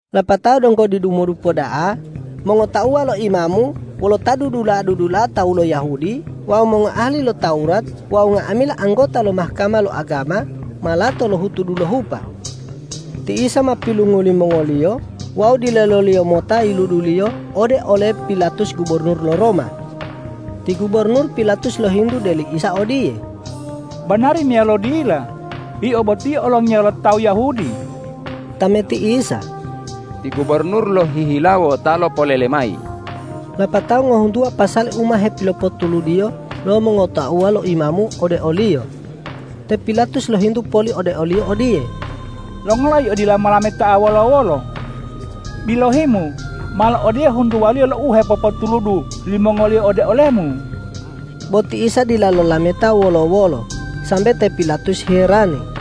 Lapatao donggo didimodupa da'a mongotauwa lo imamu wolo ta dudula'a-dudula'a tawu lo Yahudi wawu mongoahali lo Tawurat wawu nga'amila anggota lo Mahkama lo agama ma lato lohutu dulohupa. Ti Isa ma pilungu limongoliyo wawu dileloliyo mota yiluduliyo ode ole Pilatus gubornur lo Roma. Ti gubornur Pilatus lohintu de li Isa odiye,”Banari meyalo dila Yio boti olongiya lo tawu Yahudi?” Tameti Isa,”Ti gubornur lohihilawo ta lopolele mayi.” Lapatao ngohuntuwa pasali u ma hepilopotuludiyo lo mongotauwa lo imamu ode o-Liyo. Te Pilatus lohintu poli ode o-Liyo odiye,”Longola Yio dila molameta wolo-wolo? Bilohi-Mu malo odiye huntuwaliyo lo u hepopotuludu limongoliyo ode ole-Mu!” Bo ti Isa dila lolameta wolo-wolo, sambe te Pilatus herani.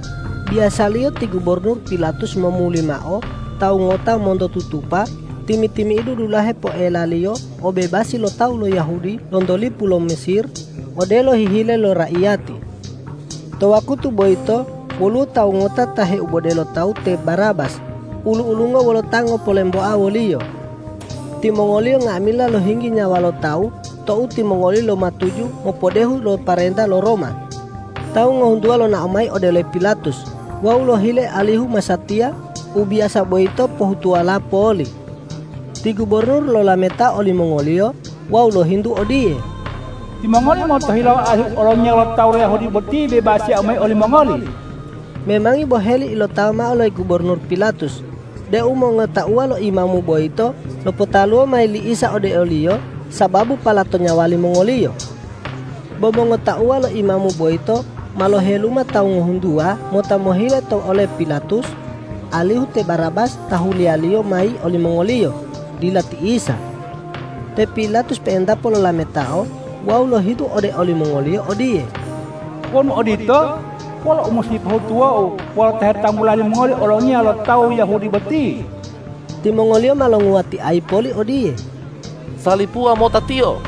Biyasaliyo ti gubornur Pilatus momuli mao tawu ngota monto tutupa timi-timi'idu dulahe poelaliyo obebasi lo tawu lo Yahudi lonto lipu lo Mesir, odelo hihile lo raiyati. To wakutu boyito woluwo tawu ngota ta heibode lo tawu te Barabas ulu-ulungo wolo ta ngopolemboa woliyo. Timongoliyo nga'amila lohinggi nyawa lo tawu tou timongoliyo lomatuju mopodehu lo pomarenta lo Roma. Tawu ngohuntuwa lonao mayi ode ole Pilatus wawu lohile alihu masatiya u biyasa boyito pohutuwola poli. Ti gubornur lolametao olimongoliyo wawu lohintu odiye,”Timongoli motohilawo alihu Olongiya lo tawu lo Yahudi boti bebasiyau mayi olimongoli?” Memangi boheli ilotawa mao li gubornur Pilatus deu mongotauwa lo imamu boyito lopotaluwo mayi li Isa ode oliyo sababu palato nyawa limongoliyo. Bo mongotauwa lo imamu boyito ma loheluma tawu ngohuntuwa mota mohile to ole Pilatus alihu te Barabas ta huliyaliyo mayi olimongoliyo, dila ti Isa. Te Pilatus pe'entapo lolametao wawu lohintu ode olimongoliyo odiye,”Wonu odito, wolo u musi pohutuwou wolo Ta hetanggula limongoli olongiya lo tawu Yahudi boti?” Timongoliyo ma longuwatiayi poli odiye,”Salipuwa mota Tiyo!”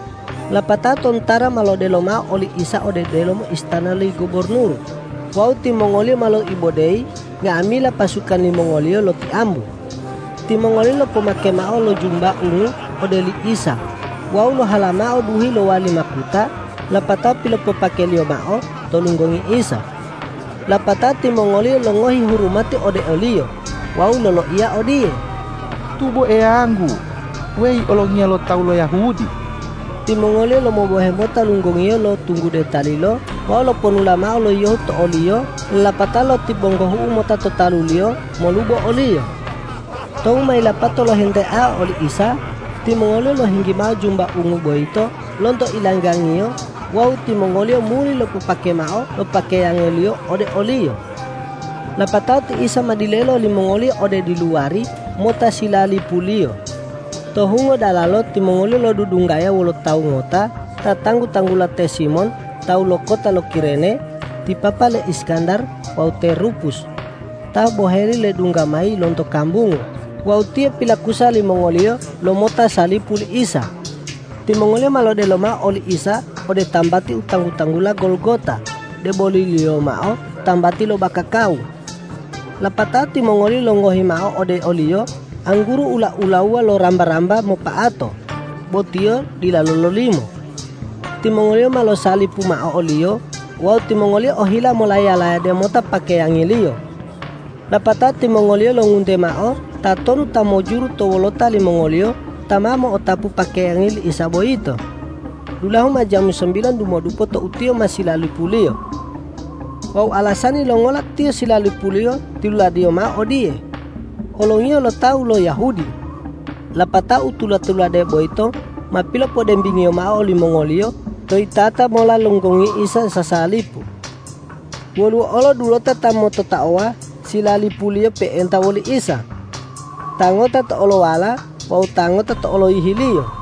Lapatao tontara ma lodelo mao oli Isa ode delomo istana li gubornur wawu timongoliyo ma loibodeyi nga'amila pasukan limongoliyo lotiambu. Timongoliyo lopopake mao lo jumba ungu ode li Isa wawu lohalamao duhi lowali makuta lapatao pilopopakeliyo mao to lunggongi Isa. Lapatao timongoliyo longohi hurumati ode o-Liyo wawu loloiya odiye,”Tubo Eyanggu weyi olongiya lo tawu lo Yahudi!” Timongoliyo lomobohe mota lunggongiyo lo tunggude talilo wawu loponula mao lo yiyohu to o-Liyo lapatao lotibonggohu'u mota to talu-Liyo molubo o-Liyo. Tou ma yilapato lohenteao oli Isa, timongoliyo lohinggi mao jumba ungu boyito lonto ilanggang-Iyo wawu timongoliyo muli lopopake mao lo pakeyangi-Liyo ode o-Liyo. Lapatao ti Isa ma dilelo limongoliyo ode diluwari mota silalipuliyo. To hungo dalalo timongoliyo lodudunggaya wolo tawu ngota ta tanggu-tanggula te Simon tawu lo kota lo Kirene, ti papa le Iskandar wawu te Rupus, ta boheli ledungga mayi lonto kambungu, wawu tiyo pilakusa limongoliyo lomota salipu li Isa. Timongoliyo ma lodelo mao oli Isa ode tambati u tanggu-tanggula Golgota, deboliliyo mao tambati lo bakakawu. Lapatao timongoliyo longohi mao ode o-Liyo angguru ula-ulawu lo ramba-ramba mopa'ato, bo Tiyo dila lololimo. Timongoliyo ma losalipu mao o-Liyo wawu timongoliyo ohila molaya-layade mota pakeyangi-Liyo. Lapatao timongoliyo longunte mao tatonu ta mujuru to wolota limongoliyo ta ma mo'otapu pakeyangi li Isa boyito. Dulahu ma jamu sambilan dumodupo tou Tiyo ma silalipuliyo. Wawu alasani longola Tiyo silalipuliyo tiluladiyo mao odiye,”Olongiya lo tawu lo Yahudi.” Lapatao u tula-tulade boyito ma pilopodembingiyo mao limongoliyo to yitata mola lo lunggongi Isa sasalipu. Woluwo olo dulota ta mototaowa silalipuliyo pe'enta woli Isa. Ta ngota to olowala wawu ta ngota to oloyihi-Liyo.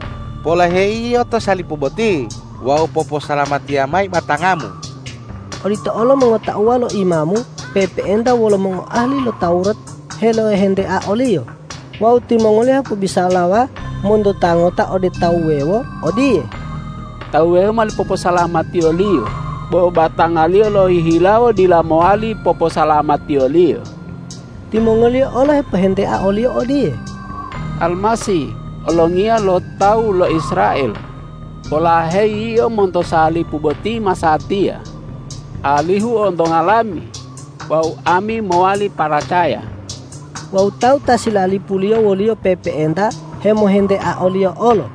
Polaheyi Yio to salipu boti wawu poposalamatiya mayi batanga-Mu!” Odito olo mongotauwa lo imamu pe'epe'enta wolo mongoahali lo Tawurat helohentea o-Liyo wawu timongoliyo hepobisalawa monto ta ngota ode tawu wuwewo odiye,”Tawu wuwewo mowali poposalamatiyo-Liyo, bo batanga-Liyo lohihilawo dila mowali poposalamatiyo-Liyo!” Timongoliyo olo hepohentea o-Liyo odiye,”Almasih olongiya lo tawu lo Israel, polaheyi Yio monto salipu boti masatiya alihu ontonga lami wawu ami mowali paracaya.” Wawu tawu ta silalipuliyo wo-Liyo pe'epe'enta hemohentea o-Liyo olo.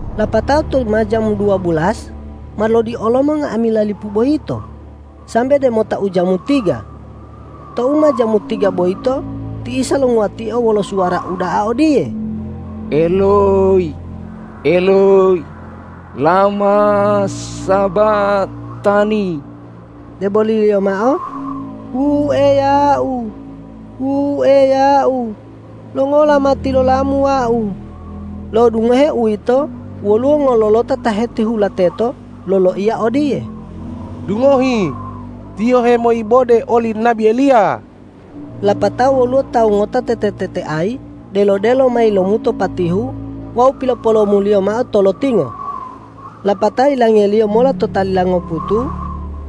Lapatao tou ma jamu dua belas, ma lodiolomo nga'amila lipu boyito, sambe demota ujamu tiga. Tou ma jamu tiga boyito ti Isa longuwatio wolo suwara uda'a odiye,”Eloyi, Eloyi, lama sabatani?” deboliliyo mao wu Eya-U, wu Eya-U, longola ma tilola-Mu Wau? Lo'odungohe uwito woluwo ngololota ta hetihula teto loloiya odiye,”Dungohi, Tiyo hemoibode oli nabi Eliya.” Lapatao woluwo tawu ngota tete-teteayi delo-delo mayi lomuto patihu wawu pilopolomoliyo mao to lotingo. Lapatao yilangeliyo mola to talila ngoputu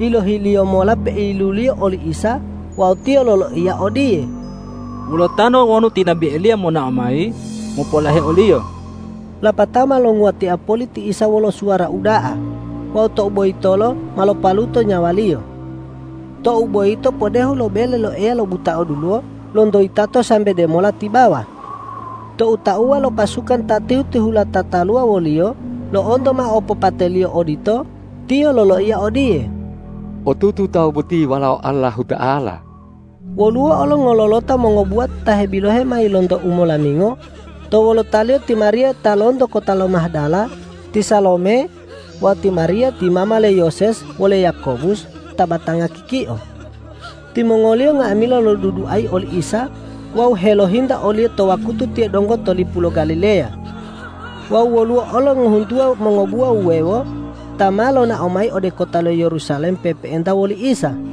yilohiliyo mola peiyiluliyo oli Isa wawu tiyo loloiya odiye,”Wulatanto wonu ti nabi Eliya monao mayi mopolahe oliyo.” Lapatao ma longuwatia poli ti Isa wolo suwara uda'a wawu tou boyitolo ma lopaluto nyawa-Liyo. Tou boyito podehu to bele lo Eya lobuta'a duluwo lonto yitato sambe demola tibawa. Tou tauwa lo pasukan ta tihu-tihula tataluwa wo-Liyo lo'onto mao opopate-Liyo odito, tiyo loloiya odiye,”Otutu tawu boti Walao Allahuta'ala!” Woluwo olo ngololota mongobuwa ta hebilohe mayi lonto umolamingo, to wolotaliyo ti Mariya ta lonto kota lo Mahdala, ti Salome wawu ti Mariya ti mama le Yoses wole Yakobus ta batanga kikio. Timongoliyo nga'amila loduduayi oli Isa wawu helohinta o-Liyo to wakutu Tiyo donggo to lipu lo Galileya. Wawu woluwo olo ngohuntuwa mongobuwa wuwewo ta ma lonao mayi ode kota lo Yerusalem pe'epe'enta woli Isa.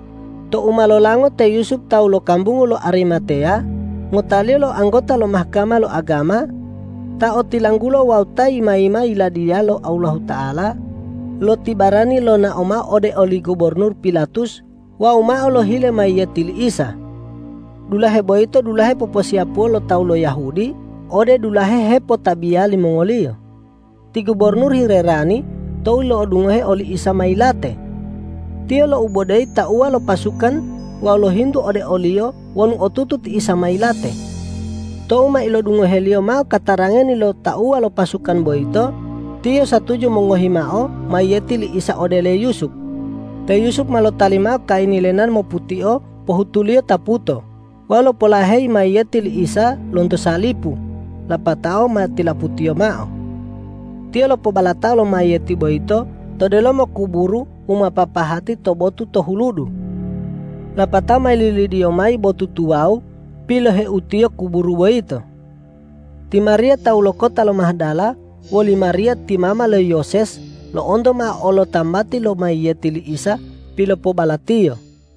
Tou ma lolango te Yusup tawu lo kambungu lo Arimateya, ngotaliyo lo anggota lo Mahkama lo agama, ta otilanggulo wawu ta yima-yima Yiladiya lo Allahuta'ala, lotibarani lonao mao ode oli gubornur Pilatus wawu mao lohile mayiyeti li Isa. Dulahe boyito dulahe poposiyapuwaliyo lo tawu lo Yahudi ode dulahe hepotabiya limongoliyo. Ti gubornur hilerani tou lo'odungoheo oli Isa ma yilate. Tiyo loibodeyi tauwa lo pasukan wawu lohintu ode oliyo wonu otutu ti Isa ma yilate. Tou ma ilodungoheliyo mao katarangani lo tauwa lo pasukan boyito, tiyo satuju mongohi mao mayiyeti li Isa ode le Yusup. Te Yusup ma lotali mao kayini lenan moputio pohutuliyo taputo wawu lopolaheyi mayiyeti li Isa lonto salipu lapatao ma tilaputiyo mao. Tiyo lopobalatao lo mayiyeti boyito to delomo kuburu u ma papahati to botu to huludu. Lapatao ma yililidiyo mayi botu tuwawu piloheutiyo kuburu boyito. Ti Mariya tawu lo kota lo Mahdala woli Mariya ti mama le Yoses lo'onto mao olo tambati lo mayiyeti li Isa pilopobalatiyo.